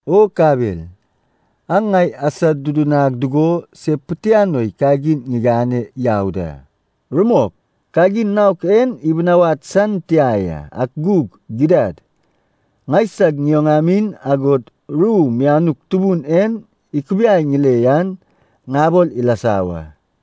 O kabel, aŋ ŋai asodudunag dugo se pitianoi kagin ŋigane yau da. Rumok, kagin naok en ibinawad san tia ya, ak gug gidad, ŋaisag ŋioŋamin, agod ru mianuk Tubun en ikubiai ŋile yan ŋabol ilasa wa.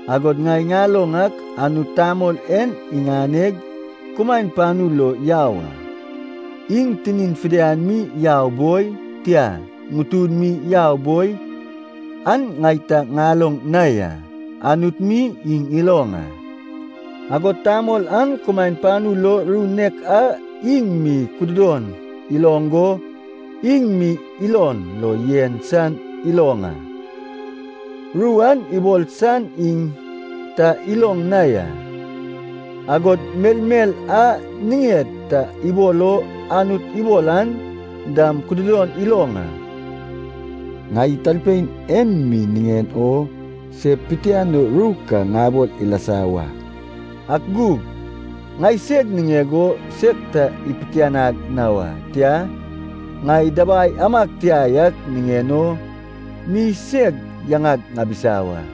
Agod ŋai ŋaloŋ ak Anut tamol en iŋaneg kumaen panu lo yau a. Iŋ tinin fidian mi yau boi, tia, ŋutun mi yau boi, an ŋai ta ŋaloŋ na ya. Anut mi iŋ iloŋ a. Agod tamol an kumaen panu lo ru nek a iŋ mi kududon iloŋ go iŋ mi ilon lo yen san iloŋ a, ru an ibol san iŋ ta iloŋ na ya. Agod melmel a niŋed ta ibol o Anut ibol an dam kududon iloŋ a. Ŋai talpein en mi niŋen o se pitianoi ru ka ŋabol ilasa wa, ak gug ŋaiseg niŋeg o seg ta ipitianag na wa. Tia, ŋai dabai amag tia yak niŋen o mi seg yaŋag ŋabisa wa.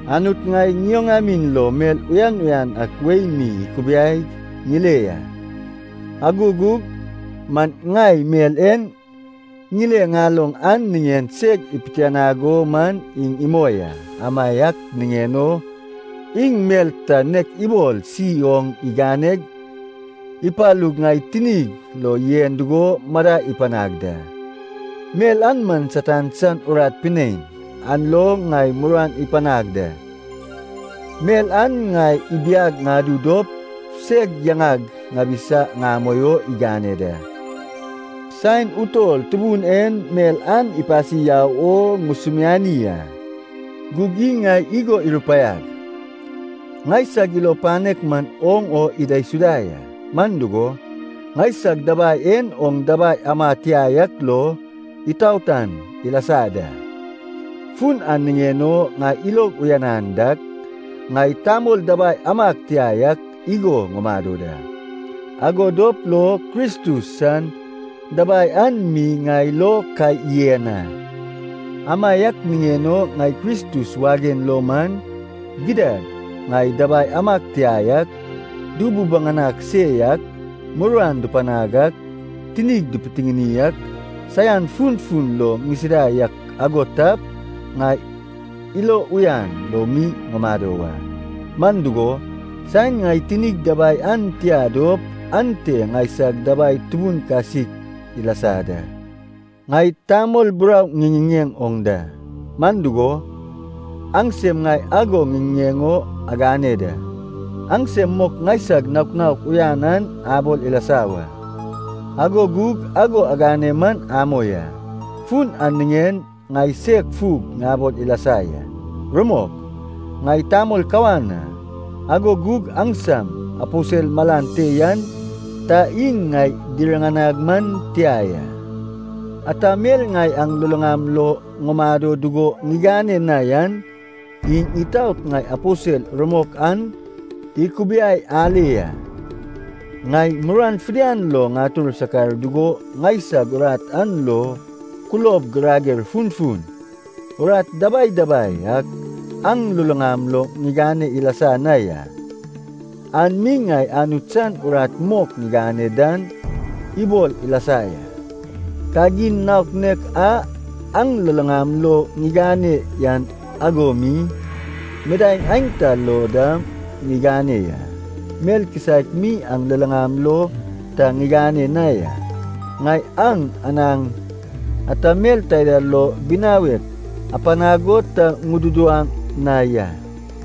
Anut ŋai ŋioŋamin lo mel uyan uyan ak wei mi ikubiaig ŋile ya. Ago gug man ŋai mel en ŋile ŋaloŋ an niŋen seg ipitianag o man iŋ imoi a. Amaiak niŋen o iŋ mel ta nek ibol si oŋ iganeg ipalug ŋai tinig lo yen dugo madai ipanag da. Mel an man Satan san urat pinein, an lo ŋai muruan ipanag da. Mel an ŋai ibiag ŋadu dop seg yaŋag ŋabisa ŋamoi o igane da. Saen utol Tubun en mel an ipasi yau wo ŋusumiani a. Gug iŋ ŋai igo irupaiag, “Ŋaisag ilo panek man oŋ o idaisuda ya. Man dugo, ŋaisag dabai en oŋ dabai ama tia yak lo itaotan ilasa da.” Fun an niŋen o ŋai ilog uyanan dak, ŋai tamol dabai amag tia yak igo ŋumado da. Ago dop lo Kristus san dabai an mi ŋai lo ka yen a. Amaiak niŋen o ŋai Kristus wagen lo man, gidad ŋai dabai amag tia yak, dububaŋanag se yak, muruan dupanag ak, tinig dipitiŋini ak, saian funfun lo ŋisida yak ago tap, ŋai ilo uyan lo mi ŋumado wa. Man dugo, saen ŋai tinig dabai an tia dop, ante ŋaisag dabai tubun kasik ilasa da. Ŋai tamol burau ŋiŋiŋeŋ oŋ da, man dugo, aŋsem ŋai ago ŋiŋiŋeŋ o agane da. Aŋsem mok ŋaisag naok naok uyan an abol ilasa wa, ago gug ago agane man amoi a. Fun an niŋen ŋai seg fug ŋabol ilasa ya. Rumok, ŋai tamol kawan a, ago gug aŋsam “aposel malan te yan” ta iŋ ŋai diriŋanag man tia ya. Ata mel ŋai aŋ luluŋam lo ŋumado dugo ŋigane na yan, iŋ itaot ŋai aposel rumok an ikubiai ale ya. Ŋai muruan fidian lo ŋatur sakar dugo ŋaisag urat an lo kulob girager funfun, urat dabai dabai ak aŋ luluŋam lo ŋigane ilasa na ya. An mi ŋai Anut san urat mok ŋigane dan ibol ilasa ya. Kagin naok nek a aŋ luluŋam lo ŋigane yan ago mi, midaeŋ aenta lo dam ŋigane ya. Mel kisaek mi aŋ luluŋam lo ta ŋigane na ya. Ŋai aŋ anaŋ ata mel taida lo binawek apanag o ta ŋududuwaŋ na ya.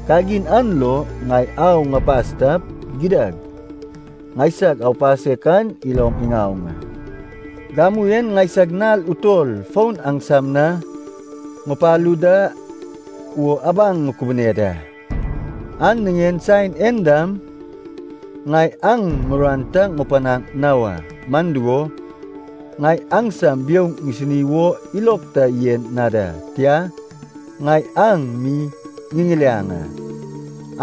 Kagin an lo ŋai au ŋupas tap, gidad ŋaisag aupasek an ilom iŋaoŋ a! Gamu en ŋaisag nal utol fon aŋsam na ŋupalu da wo abaŋ ŋukubune da. An niŋen saen en dam ŋai aŋ muruan ta ŋupanaŋ na wa, man dugo, ŋai aŋsam biouŋ ŋisini wo ilog ta yen na da. Tia, ŋai aŋ mi ŋiŋiliaŋ a.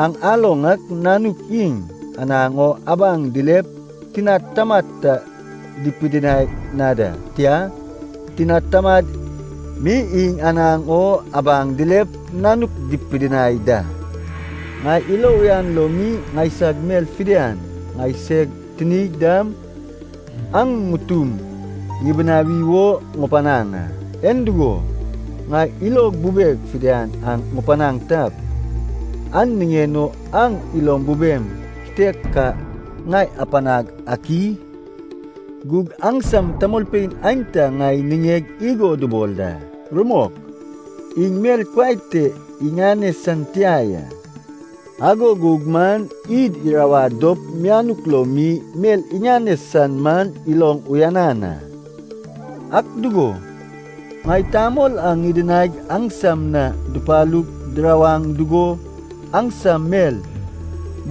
Aŋ aloŋ ak nanuk iŋ anaŋ o abaŋ dilep tinad tamad ta dipidinai na da, tia, tinan taman mi iŋ anaŋ o abaŋ dilep nanuk dipidinai da. Ŋai ilo uyan lo mi ŋaisag mel fidian, ŋaiseg tinig dam, aŋ ŋutum ŋibinawi wo ŋupanaŋ a. En dugo, ŋai ilog bubeg fidian aŋ ŋupanaŋ tap, an niŋen o aŋ ilom bubem kitek ka ŋai apanag ak i? Gug aŋsam tamolpein aenta ŋai niŋeg igo dubol da, “Rumok, iŋ mel kuai te iŋane san tia ya, ago gug man id irawad dop mianuk lo mi mel iŋane san man iloŋ uyanan a.” Ak dugo, ŋai tamol a ŋidinaig aŋsam na dupalug dirawaŋ dugo aŋsam mel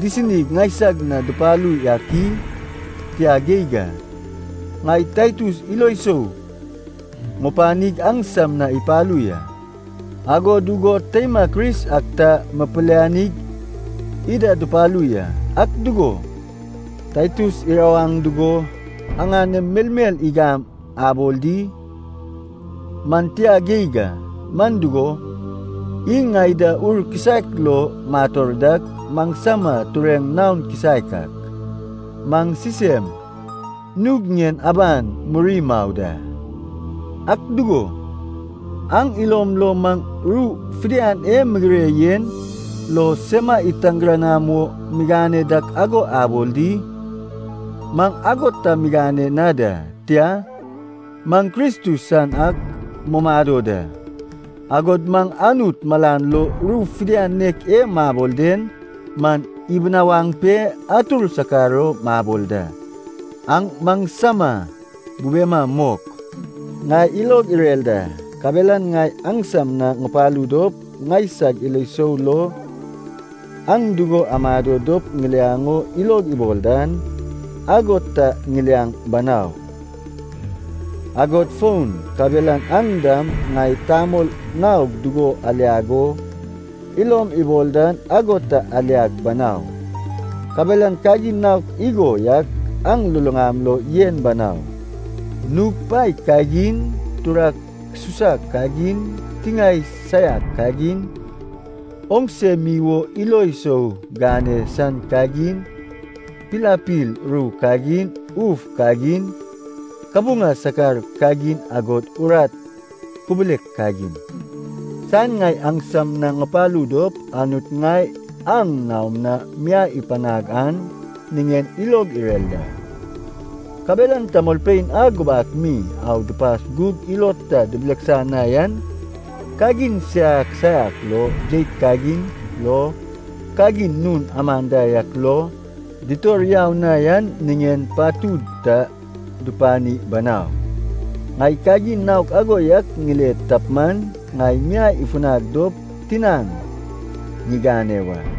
disinig ŋaisag na dupalu yak i? Tia geig a. Ŋai Taitus ilo sou ŋupanig aŋsam na ipalu ya, ago dugo teima Kris ak ta ŋipilianig ida dupalu ya. Ak dugo, Taitus irawaŋ dugo aŋanem melmel igam abol di? Man tia geig a, man dugo, iŋ ŋai da Ur kisaek lo mator dak, maŋsama tureŋ naon kisaek ak, maŋ sisem nug ŋien aban muri mau da. Ak dugo, aŋ ilom lo maŋ ru fidian e migire yen lo sema itargiranama wo migane dak ago abol di? Maŋ ago ta migane na da. Tia, maŋ Kristus san ak mumado da, agod maŋ Anut malan lo ru fidian nek e mabol den man ibinawaŋ pe atur sakar o mabol da. Aŋ maŋsama bubema mok. Ŋai ilog irer da. Kabelan ŋai aŋsam na ŋupalu dop, ŋaisag ilo sou lo aŋ dugo amado dop ŋiliaŋ o ilog ibol dan, ago ta ŋiliaŋ banau. Agod fon, kabelan aŋ dam ŋai tamol naog dugo aliag o ilom ibol dan ago ta aliag banau. Kabelan kagin naok igo yak aŋ luluŋam lo yen banau. Nug paek kagin, turak susak kagin, tiŋae saiak kagin, oŋse mi wo ilo sou gane san kagin, pilapil ru kagin, uf kagin, kabuŋa sakar kagin agod urat kubulek kagin. Saen ŋai aŋsam na ŋupalu dop Anut ŋai aŋ naom na miai ipanag an niŋen ilog irer da. Kabelan tamolpein a gubak mi au dupas gug ilod ta dibileksa na yan, kagin saiak saiak lo, jeit kagin lo, kagin nun aman da yak lo, ditor yau na yan niŋen patud ta dupani banau. Ŋai kagin naok ago yak ŋile tap man, ŋai miai ifunag dop tinaŋ ŋigane wa.